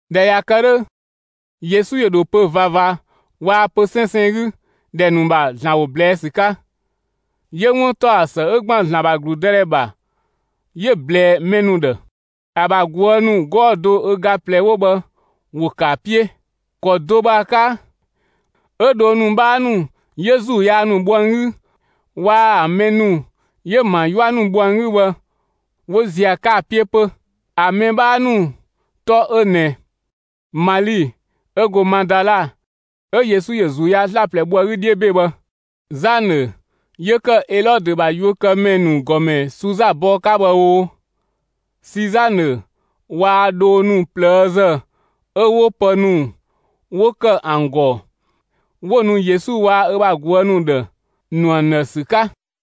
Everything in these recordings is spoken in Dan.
꞊Dhɛ ꞊ya kë 'dhö, Yesu ‑yö ‑dho pö‑ ꞊vava waa‑ pö‑ 'sɛnsɛn 'gü ‑dhɛ ‑nu ‑bha ‑Zlan ‑wo ꞊blɛɛ' ‑sü 'ka; 'yö 'wuntaɔsë 'ö ‑gban ‑Zlan ‑bha ‑gludëdhɛ ‑bha, 'yö‑ ꞊blɛɛ mɛ ‑nu ‑dhë. ‑A ‑bha ꞊guë' ‑nu 'gɔɔ‑ do ö ga ꞊plɛ 'wo bhë ‑wo ‑kë ‑a 'piö. ‑Kɔ do bhë ‑a 'ka 'ö dhoo ‑nu 'bhaa ‑nu 'yö ‑zuu yaa ‑nu bho ‑an 'gü waa‑ ‑a mɛ ‑nu 'yö ‑an ‑bha 'yua ‑nu bho ‑an 'gü bhë, 'wo ‑ziö ‑a 'ka ‑a 'piö 'pö. ‑A mɛ 'bhaa ‑nu 'tɔ 'ö ꞊nɛ: Mali 'ö go Madala 'ö Yesu ‑yö ‑zuu yaa 'slaplɛ bho ‑a 'gü 'dhiö ‑be bhë, Zanë 'yö ‑kë Elɔdö ‑bha yuökëmɛ ‑nu ‑gɔmɛ Suza bɔɔ 'ka bhë oo, Sizanë waa‑ dhoo ‑nu ꞊plëëzë 'ö 'wo pë ‑nu 'wo ‑kë ‑an ‑gɔ, 'wo‑ nu Yesu waa‑ ö bha ꞊guë' ‑nu ‑dhë, ‑nu ‑an ‑dhë ‑sü 'ka.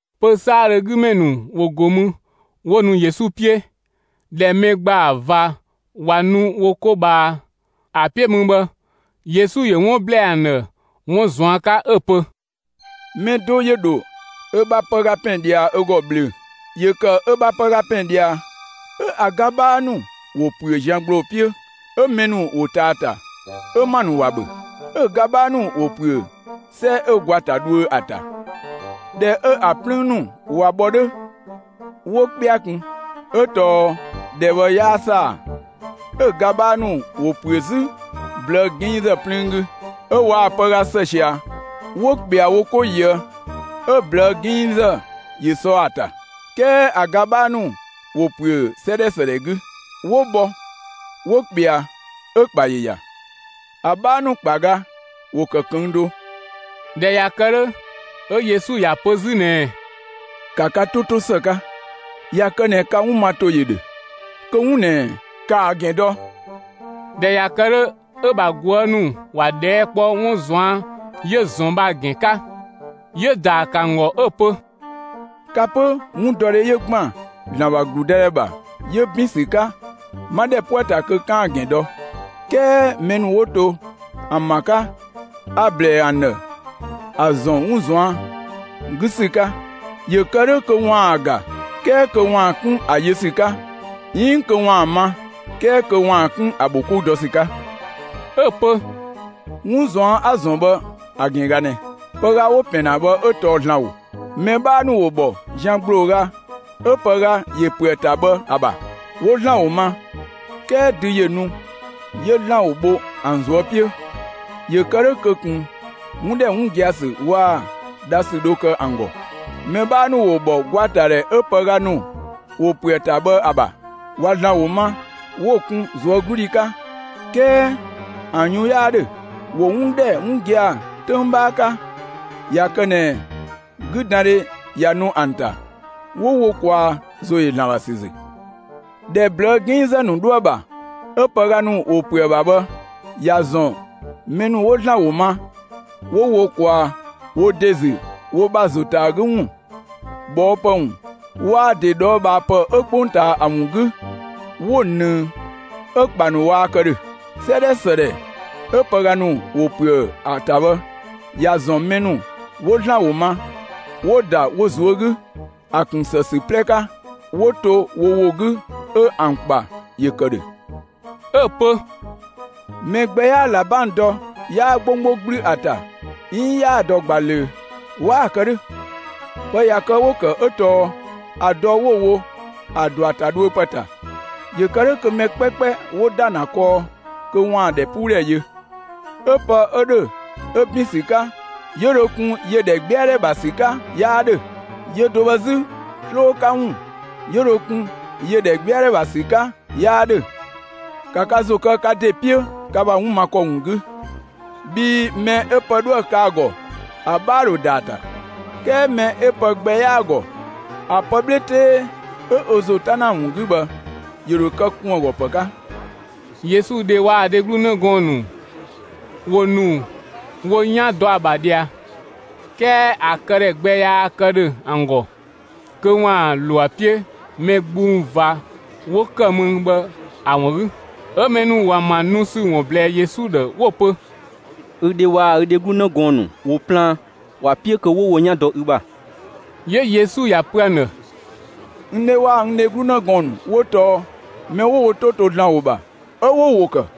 Pö‑ 'saadhö ‑a 'gü ‑mɛ ‑nu ‑wo ‑go mü, 'wo nu Yesu 'piö. ꞊Dhɛ mɛ ‑gbaa ꞊va ꞊wa nu wo 'ko ꞊bhaa ‑a 'piö mü bhë, Yesu ‑yö 'wun ꞊blɛɛ ‑an ‑dhë 'wun ꞊zuan' 'ka 'ö‑ pö: «Mɛ do ‑yö ‑dho ö bha pëga ‑pɛn ꞊dhia ö ‑gɔ ꞊bhlöö‑. ‑Yö ‑kë ö bha pëga ‑pɛn ꞊dhia, 'ö ‑a ga 'bhaa ‑nu ‑wo ‑püö zian ‑gbloo 'piö, 'ö mɛ ‑nu ‑wo ꞊taa ‑a ‑ta, 'ö ‑ma ‑nu ‑wa ‑bhö. 'Ö‑ ga 'bhaa ‑nu ‑wo ‑püö 'sɛ 'ö gwa ‑ta dhuö ‑a ‑ta. ꞊Dhɛ 'ö ‑a 'plüün ‑nu ꞊wa bhɔ 'dhö, 'wo 'kpɛa kun, 'ö tɔɔ ‑dhɛ bhë 'yaa ‑saa. 'Ö‑ ga 'bhaa ‑nu ‑wo ‑püö 'zü ꞊blëë' 'ginngzë 'plüün 'gü, 'ö waa‑ pëga ‑së ꞊sia 'wo ꞊kpɛa wo 'ko ꞊yië', 'ö ꞊blëë' 'ginngzë ‑yö sɔ ‑a ‑ta. 'Kɛɛ ‑a ga 'bhaa ‑nu ‑wo ‑püö 'sɛ ‑dhɛ ‑së ‑dhɛ 'gü; 'wo bhɔ 'wo ꞊kpɛa, 'ö‑ ‑kpa ‑yö ‑ya; ‑a 'bhaa ‑nu ‑kpa ga ‑wo ‑kë ꞊këng' do.» ꞊Dhɛ ꞊ya kë 'dhö, 'ö Yesu ‑ya pö 'zü ꞊nɛɛ: «‑Ka ka 'to 'to ‑së 'ka, ꞊ya kë ꞊nɛ ka 'wun ma ‑to ‑yö ‑dhö, kö 'wun ꞊nɛ, ‑kaa ‑gɛn dɔ!» ꞊Dhɛ ꞊ya kë 'dhö, 'ö‑ ‑bha ꞊guë' ‑nu ‑wa ꞊dhɛɛ' kpɔ, 'wun ꞊zuan' 'yö‑ ‑zɔn bhë ‑a ‑gɛn 'ka. 'Yö‑ ‑daa ‑kë ‑an ‑gɔ 'ö‑ pö: «Ka 'pö, 'wundɔdhe 'yö ‑gban ‑Zlan ‑bha ‑gludëdhɛ ‑bha 'yö ‑bin ‑sü 'ka, 'ma ‑dhɛ 'po ‑a ‑ta kö 'kaan‑ ‑gɛn dɔ; 'kɛɛ mɛ ‑nu 'wo to ‑an ‑bha 'ka, a‑ ‑blɛɛ ‑an ‑dhë ‑a ‑zɔn 'wun ꞊zuan' 'gü ‑sü 'ka; ‑yö kë 'dhö kö ‑waan ‑a ‑ga 'kɛɛ kö ‑waan 'kun ‑a yö ‑sü 'ka, 'iin kö ‑waan ‑a ma 'kɛɛ kö ‑waan 'kun ‑a ‑bho 'kou dɔ ‑sü 'ka.» 'Ö‑ pö: «'Wun ꞊zuan' 'a‑ ‑zɔn bhë ‑a ‑gɛn ꞊ga ꞊nɛ: Pëga 'wo‑ ‑pɛn ‑na bhë 'ö tɔɔ ‑Zlan ‑wo. Mɛ 'bhaa ‑nu ‑wo ‑bhɔ zian ‑gblooga 'ö pëga ‑yö ‑püö ‑a ‑ta bhë ‑a ‑bha; 'wo ‑Zlan ‑wo ‑ma, 'kɛɛ dü ‑yö nu 'yö ‑Zlan ‑wo bho ‑an ꞊zuö' 'piö. ‑Yö kë 'dhö kö ꞊kun 'wun ‑dhɛ 'wun gia‑ ‑sü waa‑ dha ‑sü dho kë ‑an ‑gɔ. Mɛ 'bhaa ‑nu ‑wo ‑bhɔ gwatadhɛ 'ö pëga ‑nu ‑wo ‑püö ‑a ‑ta bhë ‑a ‑bha. ꞊Wa ‑Zlan ‑wo ma 'wo‑ kun ꞊zuögludhi 'ka, 'kɛɛ ‑an yun 'yaa 'dhö; ‑wo 'wun ‑dhɛ 'wun gia‑ 'töng 'bhaa 'ka; ꞊ya kë ꞊nɛ 'güdandhe ꞊ya nu ‑an ‑ta, 'wo wo ꞊kwaa ‑zo ‑yö ‑Zlan ‑bha ‑sü ‑zü. ‑Dhɛ ꞊blëë' 'ginngzë 'dho ‑a ‑bha, 'ö pëga ‑nu ‑wo ‑püö ‑a ‑bha bhë ‑ya ‑zɔn mɛ ‑nu 'wo ‑Zlan ‑wo ma 'wo wo ꞊kwaa wo ‑de ‑zü wo ‑bha ‑zo ‑ta ‑a 'gü ‑wun, ꞊bhɔɔpë ‑wun, waa‑ ‑de ꞊dhɔɔbhaapë 'ö 'kpongtaa ‑a ‑wun 'gü, 'wo ꞊nëng 'ö‑ ‑kpa ‑nu 'waa kë ‑dhö. 'Sɛ ‑dhɛ ‑së ‑dhɛ 'ö pëga ‑nu ‑wo ‑püö ‑a ‑ta bhë, ‑ya ‑zɔn mɛ ‑nu 'wo ‑Zlan ‑wo ma, 'wo‑ ‑da wo ꞊zuö' 'gü, ‑a ‑kun ‑së ‑sü 'plɛ 'ka, 'wo to wo ‑wo 'gü 'ö ‑an ‑kpa ‑yö ‑kë ‑dhö.» 'Ö‑ pö: «Mɛ gbɛ 'yaa ꞊labang dɔ, 'yaa 'gbonggbo 'gblü ‑a ‑ta, 'iin 'yaa‑ dɔ ꞊gba ꞊löö, 'waa‑ kë 'dhö. Pë ꞊ya kë 'wo‑ ‑kë 'ö tɔɔ ‑a dɔ 'wo‑ wo ‑a ‑dɔ ‑a ‑ta dhuö ‑pë ‑ta. ‑Yö kë 'dhö mɛ 'kpɛkpɛ 'wo ‑da ‑na kɔɔ kö ‑waan ‑dhɛpuudhɛ yö. 'Ö pë 'ö ‑dhö 'ö ‑bin ‑sü 'ka, 'yö dho kun ‑yö ‑dhɛgbɛadhɛ ‑bha ‑sü 'ka 'yaa 'dhö. Yö do bhë 'zü, 'sloo 'ka ‑wun 'yö dho kun ‑yö ‑dhɛgbɛadhɛ ‑bha ‑sü 'ka 'yaa 'dhö. ‑Ka ka ‑zo kë ka ‑de 'piö ka ‑bha 'wun ma ‑kɔ ‑wun 'gü! Bhii mɛ 'ö pë 'dhoë‑ kë ‑a ‑gɔ ‑a 'bhaa ‑dho ‑da ‑a ‑ta; 'kɛɛ mɛ 'ö pë gbɛ 'yaa‑ ‑gɔ, ‑a pë 'bhe 'tee 'ö ö ‑zo 'ta ‑na ‑a ‑wun 'gü bhë, ‑yö ‑dho kë ‑kun ‑a ‑gɔ ‑pë 'ka.» Yesu dhe waa‑ ‑a dheglu 'në gɔɔn‑ ‑nu ‑wo ‑nu wo 'yan dɔ ‑a ‑bha ꞊dhia, 'kɛɛ ‑a këdhɛ gbɛ yaa kë ‑dhö ‑an ‑gɔ kö ‑waan ‑lo ‑a 'piö mɛ gbung ꞊va 'wo ‑kë mü bhë ‑a ‑wun 'gü. 'Ö mɛ ‑nu ‑wo ‑an ‑bha nu ‑sü ‑wun ꞊blɛɛ Yesu ‑dhë 'wo‑ pö: «Ü dhe waa‑ ü dheglu 'në gɔɔn‑ ‑nu ‑wo plaan, ‑wa 'piö kö ‑wo wo 'yan dɔ ü ‑bha.» 'Yö Yesu ‑ya ‑pö ‑an ‑dhë: «N dhe waa‑ n dheglu 'në gɔɔn‑ ‑nu 'wo tɔɔ mɛ ‑nu 'wo wo 'to to ‑Zlan ‑wo ‑bha 'ö 'wo‑ ‑wo ‑kë.»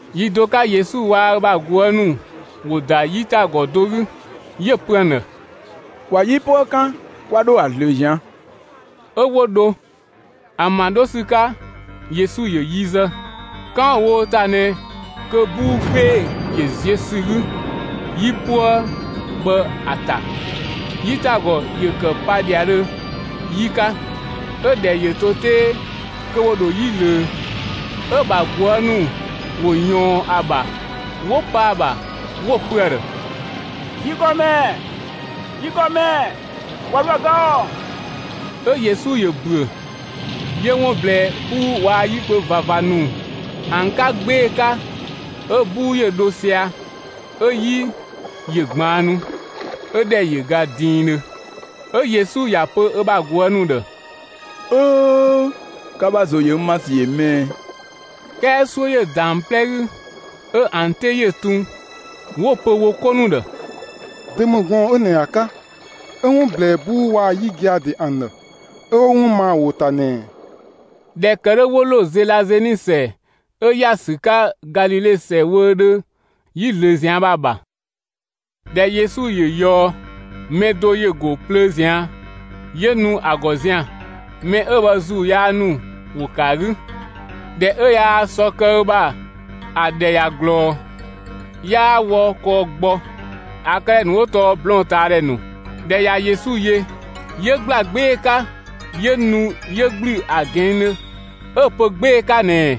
Yi do 'ka Yesu waa‑ ö bha ꞊guë' ‑nu ‑wo ‑da 'yitagɔ do 'gü, 'yö‑ pö ‑an ‑dhë: «‑Kwa 'yipuë 'kan 'kwa 'dho ‑a ꞊zlöö ꞊zian'!» 'Ö 'wo dho. ‑An ‑bha 'dho ‑sü 'ka, Yesu ‑yö yi zë. 'Kan 'wo‑ wo wo ‑ta ꞊nɛ kö 'buu 'gbee‑ ‑yö ziö ‑sü 'gü 'yipuë bhë ‑a ‑ta; 'yitagɔ ‑yö ‑kë pa ‑dhiadhö 'yi 'ka, 'ö‑ ‑dhɛ ‑yö to 'tee kö ‑wo ‑dho 'yi ꞊löö. 'Ö‑ ‑bha ꞊guë' ‑nu ‑wo ꞊yɔɔn ‑a ‑bha 'wo pa ‑a ‑bha, 'wo‑ pö ‑a ‑dhë: «Yi ‑Gɔmɛ! Yi ‑Gɔmɛ! Kwa 'dhoë‑ ga ‑ɔ!» 'Ö Yesu ‑yö ‑büö, 'yö 'wun ꞊blɛɛ 'buu waa‑ 'yikpö ꞊vava ‑nu 'wo bhë ‑an 'ka 'gbee‑ 'ka, 'ö 'buu ‑yö dho sia‑, 'ö 'yi ‑yö ꞊gbaannu, 'ö ‑dhɛ ‑yö ga diindhö. 'Ö Yesu ‑ya pö ö bha ꞊guë' ‑nu ‑dhë: «'Öö! Ka ‑bha ‑zo ‑yö n ‑ma ‑sü ‑yö 'më ꞊ɛ?» 'Kɛɛ 'suö ‑yö ‑da ‑an 'plɛ 'gü 'ö ‑an 'te ‑yö tun 'wo‑ pö wo 'ko ‑nu ‑dhë: «Dö ‑mü gɔɔn‑ 'ö ꞊nɛ ‑a 'ka, 'ö 'wun ꞊blɛɛ 'buu waa‑ 'yi gia‑ ‑de ‑an ‑dhë, 'ö 'wo 'wun ma ‑a ‑wo ‑ta ꞊nɛɛ?» ꞊Dhɛ ‑kë 'dhö 'wo ‑lo Zelazeni ‑sɛ 'ö ‑ya ‑sü 'ka Galile ‑sɛ wöödhö 'yi ꞊zlöö ꞊zian' bhë ‑a ‑bha. ꞊Dhɛ Yesu ‑yö ꞊yɔɔ, mɛ do ‑yö ‑go plöö ꞊zian' 'yö nu ‑a ‑gɔ zian‑. Mɛ 'ö bhë ‑zuu yaa ‑nu ‑wo ‑kë ‑a 'gü. ꞊Dhɛ 'ö yaa sɔ kë ö ‑bha ‑a ‑dhɛ ꞊ya ꞊glɔɔ. 'Yaa wɔ kɔɔ gbɔ, ‑a këdhɛ ‑nu 'wo tɔɔ blɔɔn‑ ꞊taa ‑dhɛ ‑nu. ꞊Dhɛ ꞊ya Yesu yö, ‑yö ‑gbla 'gbee‑ 'ka 'yö nu 'yö ‑gblü ‑a ꞊gɛɛndhö 'ö‑ pö 'gbee‑ 'ka ꞊nɛɛ: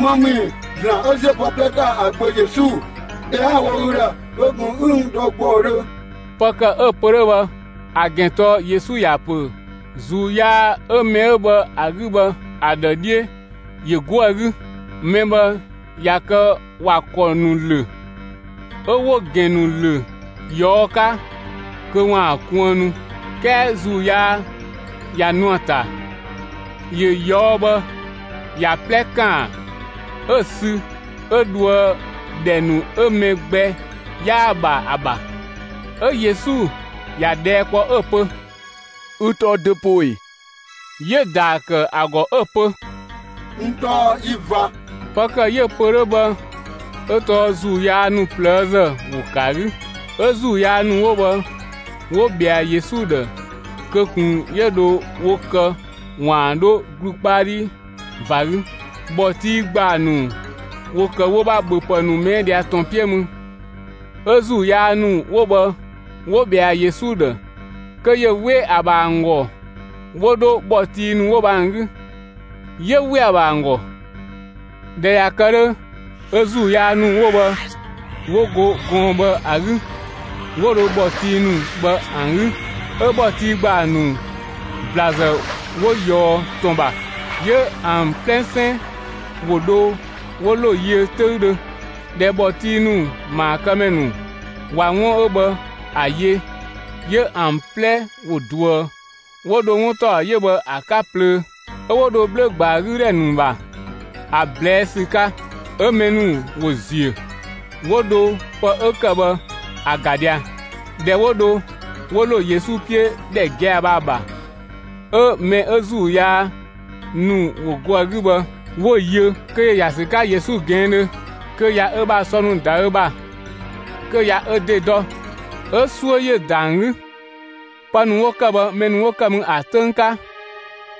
«‑Më ‑mü ‑i, ‑Zlan 'ö ‑ziö pë 'plɛ ‑ta ‑a Gbö Yesu? ꞊Bhɛa'‑ 'a‑ wo ü ‑dhë kö ꞊kun 'ü n ‑dɔ ‑gbɔudhö!» Pë ‑kë 'yö‑ pö 'dhö bhë ‑a ‑gɛn tɔɔ Yesu ‑ya ‑pö ‑zuu yaa 'ö mɛ 'ö bhë ‑a 'gü bhë ‑a ‑dhë 'dhiö ‑yö 'go ‑a 'gü. Mɛ bhë ꞊ya kë ‑wa ‑kɔ ‑nu ‑lö, 'ö 'wo‑ ‑gɛn ‑nu ‑lö ꞊yɔɔ' 'ka kö ‑waan kuënnu, 'kɛɛ ‑zuu yaa ꞊ya nu ‑a ‑ta, ‑yö ꞊yɔɔ' bhë ‑ya 'plɛ ꞊kaan 'ö‑ sü 'ö dhoë ‑dhɛ ‑nu 'ö mɛ gbɛ 'yaa‑ ‑bha ‑a ‑bha. 'Ö Yesu ‑ya ꞊dhɛɛ' kpɔ 'ö‑ pö: «Ü tɔɔ dö poo ꞊e?» 'Yö‑ ‑daa ‑kë ‑a ‑gɔ 'ö‑ pö: «N tɔɔ yi ꞊va!» Pë ‑kë 'yö‑ pö 'dhö bhë 'ö tɔɔ ‑zuu yaa ‑nu ꞊plëëzë ‑wo ‑kë ‑a 'gü. 'Ö ‑zuu yaa ‑nu 'wo bhë 'wo ꞊bhɛa Yesu ‑dhë kö ꞊kun 'yö dho wo kë ‑waan 'dho ‑glu 'kpa 'dhi ꞊va 'gü. ‑Bhɔtii ‑gbaa ‑nu ‑wo ‑kë wo ‑bha ‑bhöpë ‑nu ꞊mɛɛ' ꞊dhia ‑tɔn 'piö mü. 'Ö ‑zuu yaa ‑nu 'wo bhë 'wo ꞊bhɛa Yesu ‑dhë kö ‑yö 'we ‑a ‑bha ‑an ‑gɔ 'wo 'dho ‑bhɔtii ‑nu 'wo bhë ‑an 'gü. 'Yö ‑we ‑a ‑bha ‑an ‑gɔ. ꞊Dhɛ ꞊ya kë 'dhö, 'ö ‑zuu yaa ‑nu 'wo bhë 'wo go gɔɔn‑ bhë ‑a 'gü, 'wo dho ‑bhɔtii ‑nu ‑an 'gü. 'Ö ‑bhɔtii ‑gbaa ‑nu ‑blazë 'wo ꞊yɔɔ ‑tɔn ‑bha, 'yö ‑an 'plɛsɛn ‑wo dho 'wo ‑lo yiö 'töüdhö. ꞊Dhɛ ‑bhɔtii ‑nu ‑maakëmɛ ‑nu ꞊wa 'wun 'ö bhë ‑a yö, 'yö ‑an 'plɛ ‑wo ꞊duë 'wo dho 'wuntaɔ 'yö bhë ‑a 'ka ꞊plöö, 'ö 'wo dho bhlö‑ ‑gbaa 'gü ‑dhɛ ‑nu ‑bha ‑a ꞊blɛɛ' ‑sü 'ka. 'Ö mɛ ‑nu ‑wo ‑ziö, 'wo dho pë 'ö ‑kë bhë ‑a ‑ga ꞊dhia. ꞊Dhɛ 'wo dho, 'wo ‑lo Yesu 'piö ‑dhɛ gia‑ bhë ‑a ‑bha, 'ö mɛ 'ö ‑zuu yaa ‑nu ‑wo go ‑a 'gü bhë, 'wo‑ yö kö ‑yö ‑ya ‑sü 'ka Yesu ꞊gɛɛndhö kö ꞊ya ö bha sɔ ‑nu ‑da ö ‑bha, kö ꞊ya ö ‑de dɔ, 'ö 'suö ‑yö ‑da ‑an 'gü. Pë ‑nu 'wo ‑kë bhë mɛ ‑nu 'wo ‑kë mü ‑a 'töng 'ka,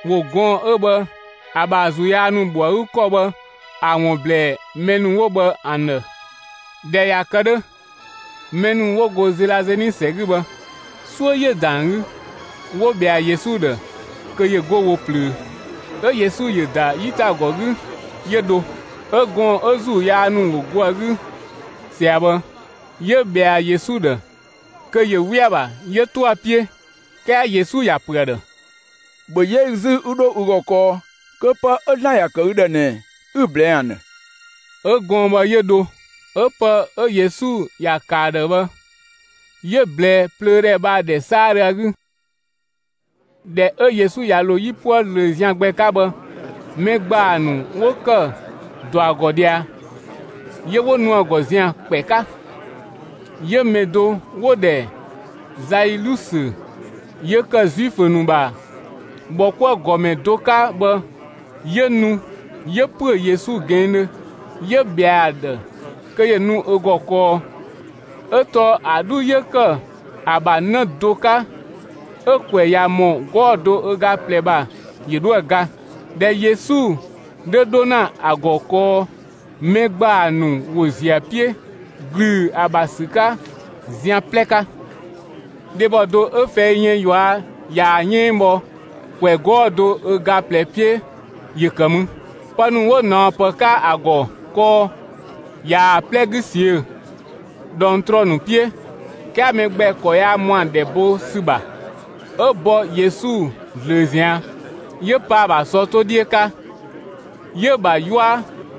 ‑wo gɔɔn‑ 'ö bhë ‑a ‑bha ‑zuu yaa ‑nu ‑bho ‑a 'gü ‑kɔ bhë, ‑a ‑wun ‑blɛɛ mɛ ‑nu 'wo bhë ‑an ‑dhë. ꞊Dhɛ ꞊ya kë 'dhö, mɛ ‑nu 'wo go Zelazeni ‑sɛ 'gü bhë, 'suö ‑yö ‑da ‑an 'gü 'wo ꞊bhɛa Yesu ‑dhë kö ‑yö 'go wo ꞊plöö. 'Ö Yesu ‑yö ‑da 'yitagɔ 'gü 'yö dho. 'Ö gɔɔn‑ 'ö ‑zuu yaa ‑nu ‑wo go ‑a 'gü ꞊sia bhë, 'yö ꞊bhɛa Yesu ‑dhë kö ‑yö 'we ‑a ‑bha 'yö 'to ‑a 'piö, 'kɛɛ Yesu ‑ya ‑pö ‑a ‑dhë: «‑Bhö 'yɛ ü 'zü 'ü 'dho ü ‑gɔ kɔɔ kö pë 'ö ‑Zlan ‑ya ‑kë ü ‑dhë ꞊nɛ 'ü‑ ꞊blɛɛ'‑ ‑an ‑dhë.» 'Ö gɔɔn‑ bhë 'yö dho, 'ö pë 'ö Yesu ‑ya ‑kë ‑a ‑dhë bhë 'yö‑ ꞊blɛɛ plöödhɛ bhë ‑a ‑dhɛ 'saadhö ‑a 'gü. ꞊Dhɛ 'ö Yesu ‑yö ‑lo 'yipuë ꞊zlöö zian gbɛ 'ka bhë, mɛ ‑gbaa ‑nu 'wo ‑kë ‑dɔ ‑a ‑gɔ ꞊dhia, 'yö 'wo ‑nu ‑a ‑gɔ zian‑ ‑kpɛ 'ka. 'Yö mɛ do 'wo‑ ‑dhɛ Zailusö 'yö ‑kë Zuifö ‑nu ‑bha ‑bhɔkuëgɔmɛ do 'ka bhë, 'yö nu 'yö ‑püö Yesu ꞊gɛɛndhö 'yö ꞊bhɛa ‑a ‑dhë kö ‑yö nu ö ‑gɔ kɔɔ, 'Ö tɔɔ ‑a 'dhu 'yö ‑kë ‑a ‑bha 'në do 'ka, 'ö‑ ‑kwɛ ꞊ya ‑mɔ 'gɔɔ‑ do ö ga ꞊plɛ ‑bha, ‑yö 'dhoë‑ ga. ꞊Dhɛ Yesu 'dhö 'dho ‑na ‑a ‑gɔ kɔɔ, mɛ ‑gbaa ‑nu ‑wo ‑ziö ‑a 'piö ‑glüü ‑a ‑bha ‑sü 'ka zian 'plɛ 'ka. Dhebɔ do 'ö fɛi yën ꞊yua' ꞊yaa‑ 'yënng bhɔ ‑kwɛ 'gɔɔ‑ do ö ga ꞊plɛ 'piö ‑yö ‑kë mü. Pë ‑nu 'wo ꞊naɔpë 'ka ‑a ‑gɔ kɔɔ, ꞊yaa‑ 'plɛ 'gü ꞊siö' ꞊dhɔngtrɔ ‑nu 'piö, 'kɛɛ mɛ gbɛ ‑kɔ yaa ‑mɔ ‑a ‑dhɛ bo ‑sü ‑bha. 'Ö bɔ Yesu ꞊zlöö ꞊zian', 'yö pa ‑a ‑bha sɔ 'to 'dhiö 'ka, 'yö‑ ‑bha 'yua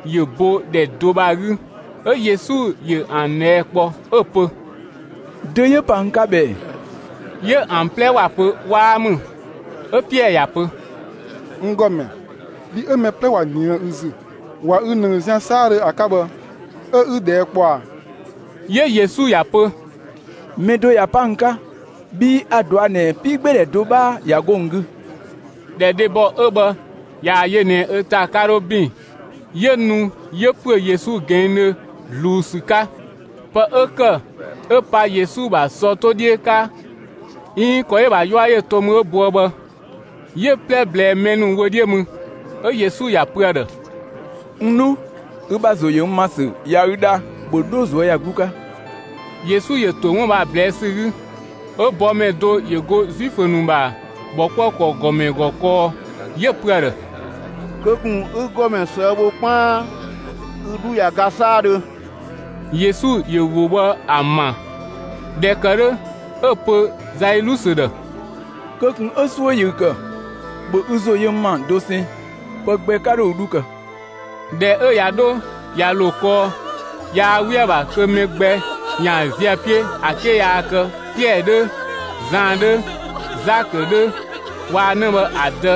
‑yö bo ‑dhɛ do bhë ‑a 'gü. 'Ö Yesu ‑yö ‑an ꞊dhɛɛ' kpɔ 'ö‑ pö: «Dö 'yö pa n 'ka bhë ꞊ɛ?» 'Yö ‑an 'plɛ ‑wa pö 'waa ‑mü. 'Ö Piɛɛ ꞊ya pö: «N ‑Gɔmɛ, bhi 'ö mɛ 'plɛ ꞊wa ꞊nië' ü ‑zü, ꞊wa ü ꞊nëng zian 'saadhö ‑a 'ka bhë 'ö 'ü ꞊dhɛɛ' kpɔ a?» 'Yö Yesu ‑ya ‑pö: «Mɛ do ꞊ya pa n 'ka, bhii a‑ ꞊dɔa' ꞊nɛ 'piigbeedhɛ do 'bhaa ꞊ya 'go n 'gü.» ꞊Dhɛ dhebɔ 'ö bhë ꞊yaa‑ yö ꞊nɛ ö ‑ta 'ka 'dho ‑bin, 'yö nu 'yö ‑püö Yesu ꞊gɛɛndhö ꞊zluun ‑sü 'ka. Pë 'ö ‑kë 'ö pa Yesu ‑bha sɔ 'to 'dhiö 'ka, 'iin ‑kɔ 'yö‑ ‑bha 'yua ‑yö to mü 'ö boë bhë, 'yö‑ 'plɛ ꞊blɛɛ mɛ ‑nu wö 'dhiö mü. 'Ö Yesu ‑ya pö ‑a ‑dhë: «N 'dhu, ü ‑bha ‑zo ‑yö n ‑ma ‑sü ꞊ya ü dha, ‑bhö 'dho ꞊zuöyagluu 'ka!» Yesu ‑yö ‑to 'wun bhë ‑a ꞊blɛɛ' ‑sü 'gü, 'ö bɔmɛ do ‑yö ‑go Zuifö ‑nu ‑bha ‑bhɔkuëkɔ ‑gɔmɛ ‑gɔ kɔɔ, 'yö‑ pö ‑a ‑dhë: «Kö ꞊kun 'ü ‑Gɔmɛ ꞊sëë' bho 'kpaan, ü 'dhu ꞊ya ga 'saadhö.» Yesu ‑yö ‑wo bhë ‑a ‑ma; ꞊dhɛ ‑kë 'dhö 'ö‑ pö Zailusö ‑dhë: «Kö ꞊kun 'ö 'suö ‑yö ü ‑kë, ‑bhö ü ‑zo yö n ‑ma dosɛn, pë gbɛ 'ka 'dho ü 'dhu kë.» ꞊Dhɛ 'ö ꞊ya 'dho ꞊ya ‑lo kɔɔ, yaa 'we ‑a ‑bha kö mɛ gbɛ ‑yaan ziö ö 'piö ‑a 'ke yaa kë Piɛɛ 'dhö, Zan 'dhö, Zakö 'dhö waa‑ 'në bhë ‑a dë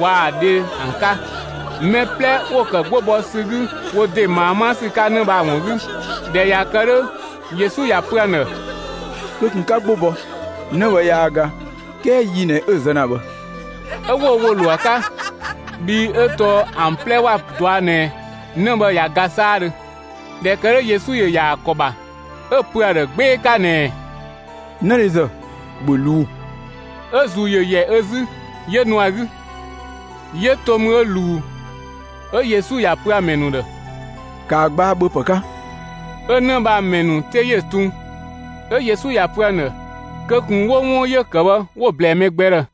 waa‑ ‑a dhe ‑an 'ka. Mɛ 'plɛ ‑wo ‑kë 'gbo bɔ ‑sü 'gü ‑wo ‑de ꞊maa 'ma ‑sü 'ka 'në bhë ‑a ‑wun 'gü. ꞊Dhɛ ꞊ya kë 'dhö, Yesu ‑ya pö ‑an ‑dhë: «Kö ꞊kun 'ka 'gbo bɔ, 'në bhë yaa ga; 'kɛɛ yi ꞊nɛ 'ö‑ zë ‑na bhë.» 'Ö 'wo wo ‑wo ‑lo ‑a 'ka, bhii 'ö tɔɔ ‑an 'plɛ ‑wa ꞊dɔa' ꞊nɛ 'në bhë ꞊ya ga 'saadhö. ꞊Dhɛ ‑kë 'dhö Yesu ‑yö ‑ya ‑a ‑kɔ ‑bha 'ö‑ pö ‑a ‑dhë 'gbee‑ 'ka ꞊nɛɛ: «'Nëdhezë, ‑bhö ꞊luu'‑!» 'Ö‑ ‑zuu ‑yö ‑yɛ ö 'zü 'yö nu ‑a 'gü, 'yö to mü 'ö ꞊luu. 'Ö Yesu ‑ya pö ‑a ‑mɛ ‑nu ‑dhë: «‑Kaa gbaa ‑bhöpë 'ka!» 'Ö 'në bhë 'ö ‑a ‑mɛ ‑nu 'te ‑yö tun. 'Ö Yesu ‑ya pö ‑an ‑dhë kö ꞊kun 'wo 'wun 'yö‑ ‑kë bhë 'wo‑ ꞊blɛɛ mɛ gbɛ ‑dhë.